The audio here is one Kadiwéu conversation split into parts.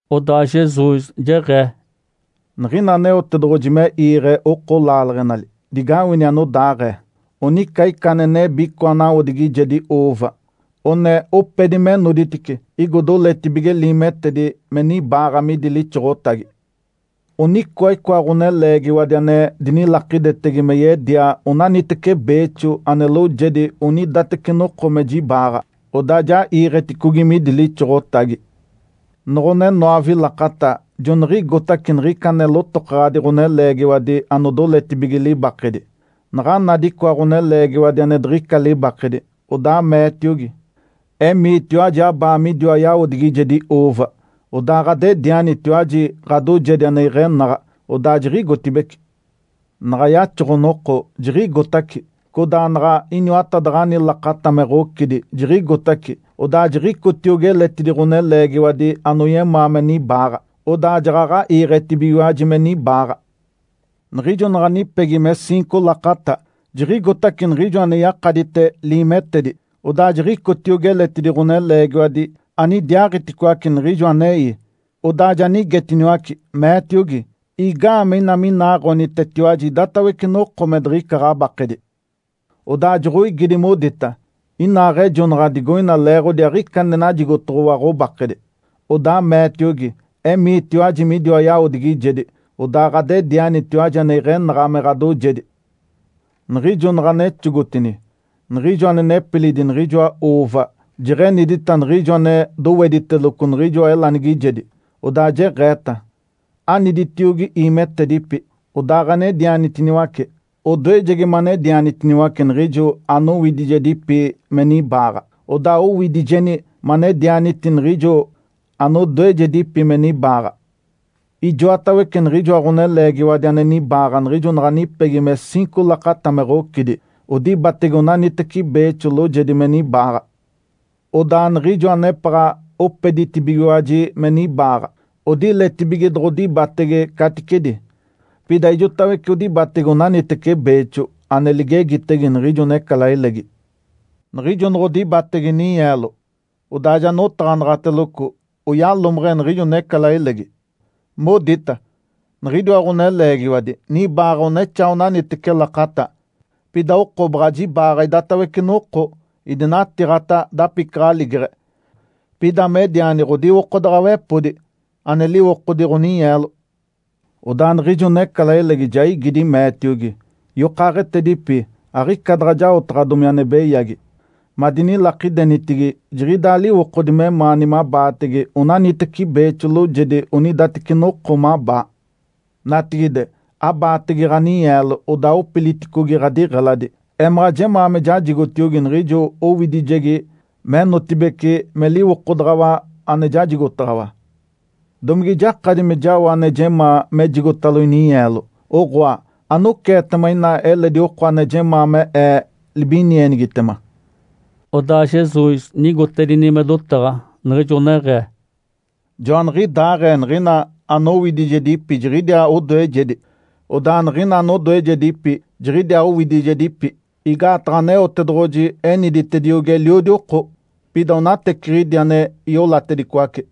Odaa Jesus jeɡ̶ee, “Niɡ̶ina Aneotedoɡ̶oji me iiɡ̶e oko laaleɡ̶enali, digawini anodaaɡ̶ee. Onica ica ane nebi icoa nawodigijedi uuva. One opedi me noditice, igo doletibige liimetedi me nibaaɡ̶a midi lixoɡ̶otagi. Onicoa icoa ɡ̶oneleegiwadi ane dinilakidetege me yedia onaniteci beexo ane loojedi onidateci noko me jibaaɡ̶a. Odaa ja iiɡ̶eticogi midi lixoɡ̶otagi. Noɡ̶one noove lakata joniɡ̶igotace niɡ̶ica ane lotokaɡ̶adi ɡ̶oneleegiwadi anodoletibige libakedi. Naɡ̶a nadi icoa ɡ̶oneleegiwadi ane diɡ̶ica libakedi, odaa meetiogi, ‘Emiitiwaji abaa midiwa yawodigijedi uuva, odaa ɡ̶adedianitiwaji ɡ̶adoojedi ane iɡ̶enaɡ̶a.’ Odaa jiɡ̶igotibeci. Naɡ̶a yaxoɡ̶o-noko jiɡ̶igotace, codaa naɡ̶a iniwatadaɡ̶ani lakata me ɡ̶ocidi, jiɡ̶igotace, odaa jiɡ̶icotiogi eletidi ɡ̶oneleegiwadi anoyemaa me nibaaɡ̶a. Odaa jaɡ̶aɡ̶a iiɡ̶etibigiwaji me nibaaɡ̶a. Niɡ̶ijo naɡ̶a nipegi me ciinco lakata, jiɡ̶igotace niɡ̶ijo ane yakadite liimetedi. Odaa jiɡ̶icotiogi eletidi ɡ̶oneleegiwadi anidiaaɡ̶iticoace niɡ̶ijo anei. Odaa ja nigetiniwace, meetiogi, ‘Igaamee ina minaaɡ̶onitetiwaji idatawece noko me diɡ̶ica ɡ̶abakedi?’ Odaa joɡ̶oigidi, modita, ‘Inaaɡ̶ejonaɡ̶a digoina leeɡ̶odi aɡ̶ica ane najigotoɡ̶owa ɡ̶obakedi.’ Odaa meetiogi, ‘Emiitiwaji midiwa yawodigijedi, odaa ɡ̶adedianitiwaji ane iɡ̶enaɡ̶a me ɡ̶adoojedi.’ Niɡ̶ijo naɡ̶a nexogotini, niɡ̶ijo ane nepilidi niɡ̶ijoa uuva jeɡ̶enidita niɡ̶ijo ane dowediteloco niɡ̶ijoa elanigijedi, odaa jeɡ̶eeta, ‘Aniditiogi iimetedipi, odaaɡ̶anedianitiniwace. Odoejegi manedianitiniwace niɡ̶ijo anowidijedipi me nibaaɡ̶a, odaa owidijeeni manedianiti niɡ̶ijo anodoejedipi me nibaaɡ̶a.’ Ijoatawece niɡ̶ijoa ɡ̶oneleegiwadi ane nibaaɡ̶a niɡ̶ijo naɡ̶a nipegi me ciinco lakata me ɡ̶ocidi, odibatege onaniteci beexo loojedi me nibaaɡ̶a. Odaa niɡ̶ijo anepaɡ̶a opeditibigiwaji me nibaaɡ̶a odiletibige doɡ̶odibatege caticedi. Pida ijotawece odibatege onaniteci beexo ane ligegitege niɡ̶ijo necalailegi. Niɡ̶ijo noɡ̶odibatege ninyeelo, odaa ja notaɡ̶anaɡ̶ateloco oyalomeɡ̶e niɡ̶ijo necalailegi. Modita, ‘Niɡ̶idiwa ɡ̶oneleegiwadi nibaaɡ̶a onexaa onaniteci lakata. Pida oko baɡ̶a jibaaɡ̶a idatawece noko idinatiiɡ̶ata dapicaɡ̶aligeɡ̶e. Pida mediani ɡ̶odiwokodaɡ̶awepodi ane liwokodi ɡ̶oninyeelo.’ Odaa niɡ̶ijo necalailegi ja igidi, meetiogi, ‘Yokaaɡ̶etedipi, aɡ̶ica daɡ̶a jaotaɡ̶adomi ane beyagi. Madinilakidenitigi jiɡ̶idaa liwokodi memaani mabaatege onaniteci beexo loojedi onidateci noko mabaa. Natigide, abaatege ɡ̶aninyeelo odaaɡ̶opiliticogi ɡ̶adiɡ̶eladi. Emaɡ̶a jemaa me jajigotiogi niɡ̶ijo owidijegi menotibeci me liwokodaɡ̶awa ane jajigotaɡ̶awa. Domige jakadi me jao ane jemaa mejigotalo ininyeelo? Oɡ̶oa, anoceetema ina eledi oko ane jemaa me ee libinienigitema?’” Odaa Jesus nigoditedini me dotaɡ̶a niɡ̶ijo neɡ̶ee, “Joaniɡ̶idaaɡ̶ee niɡ̶ina anowidijedipi jiɡ̶idiaa odoejegi, odaa niɡ̶ina anodoejedipi jiɡ̶idiaa owidijedipi. Igaataɡ̶a Aneotedoɡ̶oji eniditediogi eliodi oko, pida onateciɡ̶idi ane iolatedicoace.”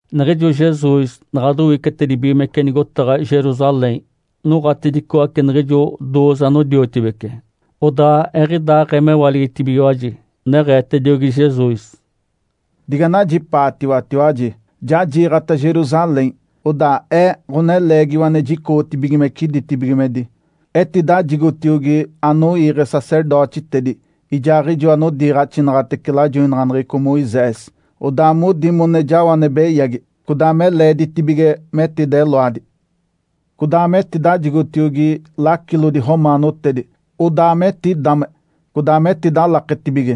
Niɡ̶ijo Jesus naɡ̶a dowicetedibigimece nigotaɡ̶a Jerusalém, noɡ̶atedicoace niɡ̶ijo dooze anodiotibece, odaa eɡ̶idaaɡ̶ee mewaligitibigiwaji, neɡ̶eetediogi Jesus, “Diganajipaatiwatiwaji! Ja jiiɡ̶ata Jerusalém. Odaa Ee, Ǥoneleegiwa ane jicoɡ̶otibigimece ditibigimedi, etidajigotiogi anoiiɡ̶e sacerdotitedi, ijaaɡ̶ijo anodiiɡ̶axinaɡ̶atece lajoinaɡ̶aneɡ̶eco Moisés. Odaa modi mone jao ane beyagi, codaa me leeditibige metideloadi. Codaa metidajigotiogi lacilodi romaanotedi. Odaa metidame, codaa metidalaketibige,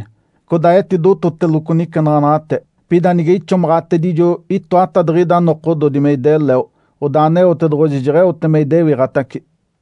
codaa etidototeloco nicenaɡ̶anaɡ̶ate. Pida nige ixomaɡ̶atedijo itoatadiɡ̶ida nokododi me ideleo, odaa Aneotedoɡ̶oji jeɡ̶eote me idewiɡ̶atace.”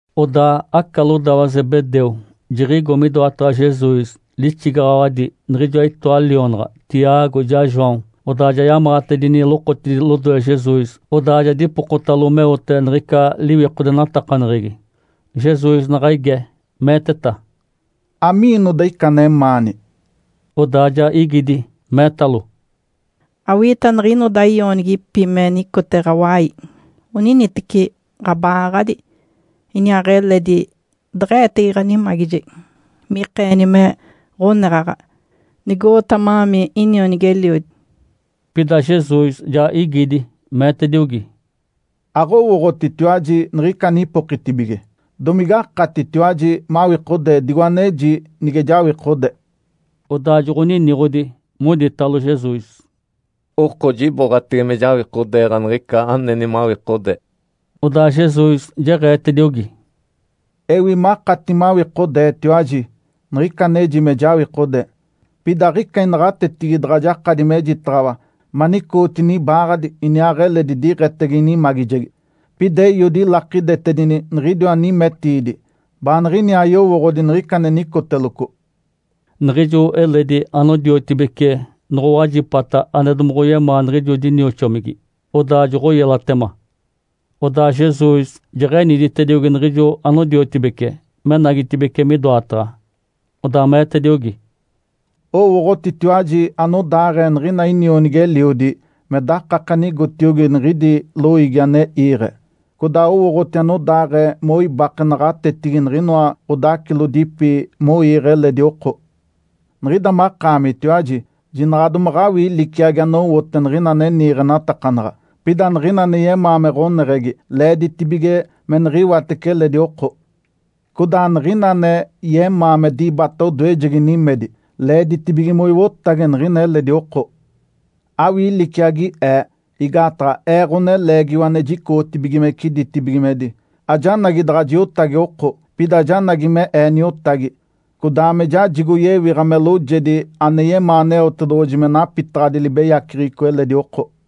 Odaa aca lodawa Zebedeu jiɡ̶igo midoataɡ̶a Jesus lixigaɡ̶awadi niɡ̶ijoa itoa lionaɡ̶a, Tiago ijaa João. Odaa ja yamaɡ̶atedini lokotidi lodoe Jesus, odaa ja dipokotalo meote niɡ̶ica liwikodenatakaneɡ̶egi. Jesus naɡ̶a ige, meeteta, “Amiinoda ica anemaani?” Odaa ja igidi, meetalo, “Awiita niɡ̶inoda ionigipi me nicote ɡ̶awai, oniniteci ɡ̶aba-aaɡ̶adi, iniaaɡ̶eledi deɡ̶e-eetege ɡ̶animagijegi mikeeni me ɡ̶oneɡ̶aɡ̶a, nigo-oota ma-aami inionigi-eliodi.” Pida Jesus ja igidi, meetediogi, “Aɡ̶owooɡ̶otitiwaji niɡ̶ica anipokitibige. Domigakatitiwaji mawikodee digo aneji nige jawikode?” Odaa joɡ̶oniniɡ̶odi, moditalo Jesus, “Oko jiboɡ̶atege me jawikodeeɡ̶a niɡ̶ica aneni mawikodee.” Odaa Jesus jeɡ̶eetediogi, “Ewi makati mawikodeetiwaji, niɡ̶ica aneji me jawikode. Pida aɡ̶ica inaɡ̶atetigi daɡ̶a jakadi mejitaɡ̶awa manicootini ibaaɡ̶adi iniaaɡ̶eledi diɡ̶etege inimagijegi. Pida Eiodi ilakidetedini niɡ̶idiwa nimetiidi, baaniɡ̶iniaa yowooɡ̶odi niɡ̶ica ane nicoteloco.” Niɡ̶ijo eledi anodiotibece noɡ̶owajipata ane domoɡ̶oyemaa niɡ̶ijo dinioxomigi, odaa joɡ̶oyelatema. Odaa Jesus jeɡ̶eniditediogi niɡ̶ijo anodiotibece menagitibeci midoataɡ̶a, odaa meetediogi, “Owooɡ̶otitiwaji anodaaɡ̶ee niɡ̶ina inionigi-eliodi me dakake ane igotiogi niɡ̶idi loiigi ane iiɡ̶e. Codaa owooɡ̶oti anodaaɡ̶ee moibake naɡ̶atetigi niɡ̶inoa ɡ̶odacilodipi moiiɡ̶e eledi oko. Niɡ̶ida makaamitiwaji jinaɡ̶a domaɡ̶awii liciagi anowote niɡ̶ina ane niiɡ̶enatakanaɡ̶a. Pida niɡ̶ina ane yemaa me ɡ̶oneɡ̶egi leeditibige me niɡ̶iwatece eledi oko. Codaa niɡ̶ina ane yemaa me dibata odoejegi nimedi leeditibige moiwotage niɡ̶ina eledi oko. Awii liciagi Ee. Igaataɡ̶a Ee, Ǥoneleegiwa ane jicoɡ̶otibigimece ditibigimedi, ajanagi daɡ̶a jiotage oko. Pida janagi me Ee niotagi, codaa me jajigo yewiɡ̶a me loojedi ane yemaa Aneotedoɡ̶oji me napitaɡ̶adi libeyaceɡ̶eco eliodi oko.”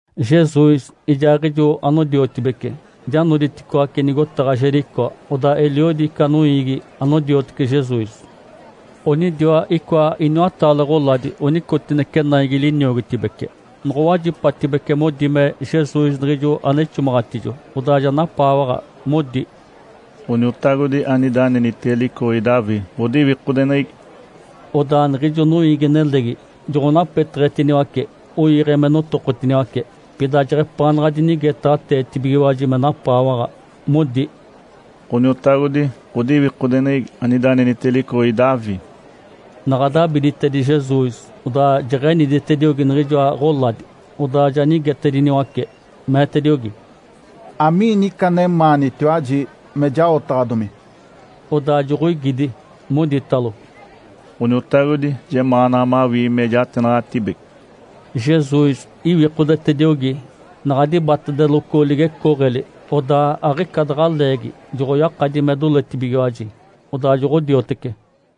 Jesus ijaaɡ̶ijo anodiotibece ja noditicoaci nigotaɡ̶a Jericó. Odaa eliodi ica noiigi anodiotece Jesus. Onidiwa icoa iniwataale ɡ̶oladi onicotinece naigi liniogotibece. Noɡ̶owajipatibece modi me Jesus niɡ̶ijo ane ixomaɡ̶atijo, odaa ja napaawaɡ̶a, modi, “Ǥoniotagodi, anida anenitege licoɡ̶egi Davi, ɡ̶odiwikodeneɡ̶egi!” Odaa niɡ̶ijo noiigi-nelegi joɡ̶onapeteɡ̶etiniwace, oiiɡ̶e me notokotiniwace. Pida jeɡ̶epaanaɡ̶a dinigetaɡ̶ateetibigiwaji me napaawaɡ̶a, modi, “Ǥoniotagodi, ɡ̶odiwikodeneɡ̶egi, anida anenitege licoɡ̶egi Davi!” Naɡ̶a dabiditedi Jesus, odaa jeɡ̶eniditediogi niɡ̶ijoa ɡ̶oladi. Odaa ja nigetediniwace, meetediogi, “Amiini ica anemaanitiwaji me jaotaɡ̶adomi?” Odaa joɡ̶oigidi, moditalo, “Ǥoniotagodi, jemaanaɡ̶a mawii me jatenaɡ̶atibece.” Jesus iwikodetediogi, naɡ̶a dibatedeloco ligecooɡ̶eli, odaa aɡ̶ica daɡ̶a leegi joɡ̶oyakadi me doletibigiwaji, odaa joɡ̶odiotece.